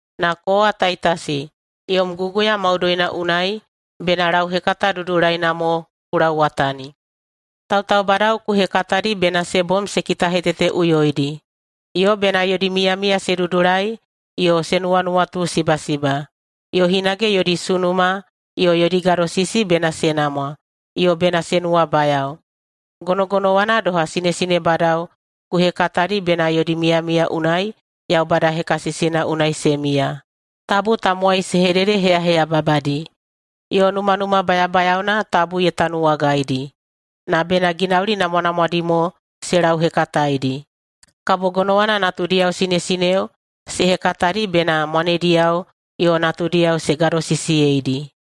Na kowa, Taitasi, yom guguya maudoina unai bena lauhekata dudulaina mo ku lauwatani. Tautaubadao ku hekatadi bena se bom se kitaheteteꞌuyoidi, yo bena yodi miyamiya se dudulai yo se nuwanuwatusibasiba. Yo hinage yodi sunuma yo yodi gadosisi bena se namwa, yo bena se nuwabayao. Gonogonowana doha, sinesinebadao ku hekatadi bena yodi miyamiya unai Yaubada hekasisina unai se miya. Tabu tamowai se hededeheyaheyababadi, yo numanuma bayabayaona tabu ye tanuwagaidi. Na bena ginauli namwanamwadi mo se lauhekataedi. Kabo gonowana natudiyao sinesineo se hekatadi bena mwanediyao yo natudiyao se gadosisiyeidi,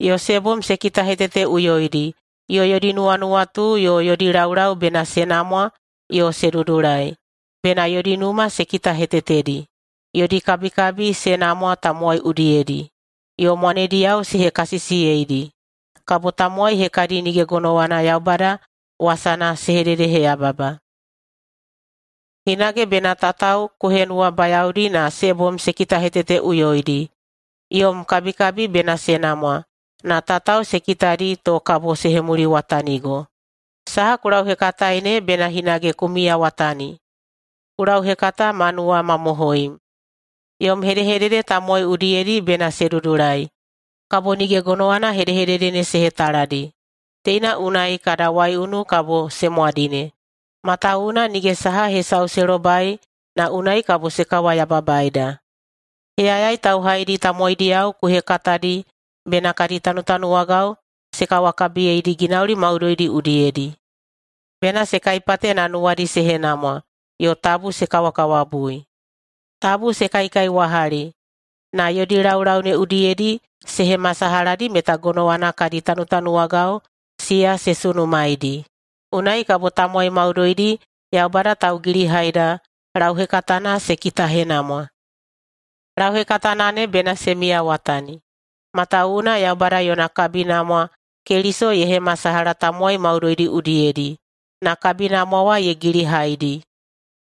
yo se bom se kitaheteteꞌuyoidi, yo yodi nuwanuwatu yo yodi laulau bena se namwa yo se dudulai. Bena yodi numa se kitahetetedi, yodi kabikabi se namwa tamowai udiyedi, yo mwanediyao se hekasisiyeidi. Kabo tamowai hekadi nige gonowana Yaubada wasana se hededeheyababa. Hinage bena tatao ku henuwabayaodi na se bom se kitaheteteꞌuyoidi. Yom kabikabi bena se namwa na tatao se kitadi to kabo se hemuliwatanigo. Saha ku lauhekatae ne bena hinage ku miyawatani. Ku lauhekata ma nuwamamohoim. Yom hedehedede tamowai udiyedi bena se dudulai, kabo nige gonowana hedehedede ne se hetaladi. Teina unai kada waiunu kabo se mwadine, matawuwuna nige saha hesau se lobai na unai kabo se kawayababaida. Heyayai tauhaidi tamowaidiyao ku hekatadi bena kadi tanutanuwagao se kawakabiyeidi ginauli maudoidi udiyedi. Bena se kaipate na nuwadi se henamwa, yo tabu se kawakawabui, tabu se kaikaiwahali, na yodi laulau ne udiyedi se hemasalahadi meta gonowana kadi tanutanuwagao siya se sunumaedi. Unai kabo tamowai maudoidi Yaubada Taugilihaida lauhekatana se kitahenamwa. [Lauhekatana ne bena se miyawatani], matawuwuna Yaubada yona kabinamwa Keliso ye hemasalaha tamowai maudoidi udiyedi, na kabinamwa wa ye gilihaidi.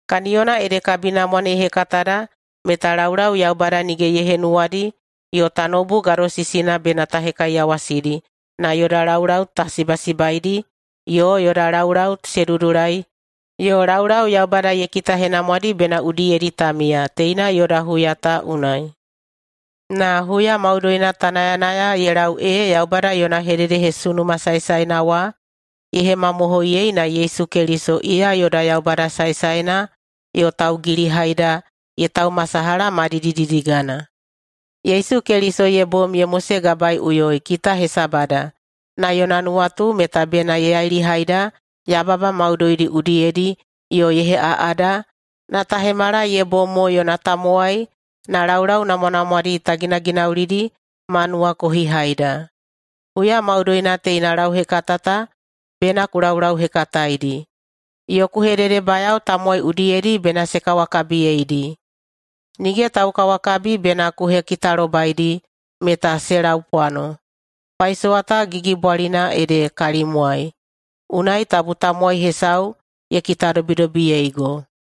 Kaniyona ede kabinamwa ne ye hekatada meta laulau Yaubada nige ye henuwadi yo tanoubu gadosisidi bena ta hekaiyawasidi na yoda laulau ta sibasibaidi yo yoda laulau se dudulai yo laulau Yaubada ye kitahenamwadi bena udiyedi ta miya, teina yoda huya ta unai. Na huya maudoina ta nayanaya ye lau ee Yaubada yona hededehesunuma saesaena wa ye hemamohoiyei na Yesu Keliso, iya yoda Yaubada saesaena yo Taugilihaida, ye taumasalaha ma didididigana. Yesu Keliso ye bom ye mosegabaeiꞌuyoi kita hesabada na yona nuwatu meta bena ye yailihaida yababa maudoidi udiyedi yo ye heꞌaꞌada na ta hemala ye bom mo yona tamowai na laulau namwanamwadi ta ginaginaulidi ma nuwakohihaida. Huya maudoina teina lauhekata ta bena ku laulauhekataedi, yo ku hededebayao tamowai udiyedi bena se kawakabiyeidi. Nige taukawakabi bena ku hekitalobaidi meta se laupwano. Paisowa ta gigibwalina ede kalimwai, unai tabu tamowai hesau ye kitadobidobiyeigo.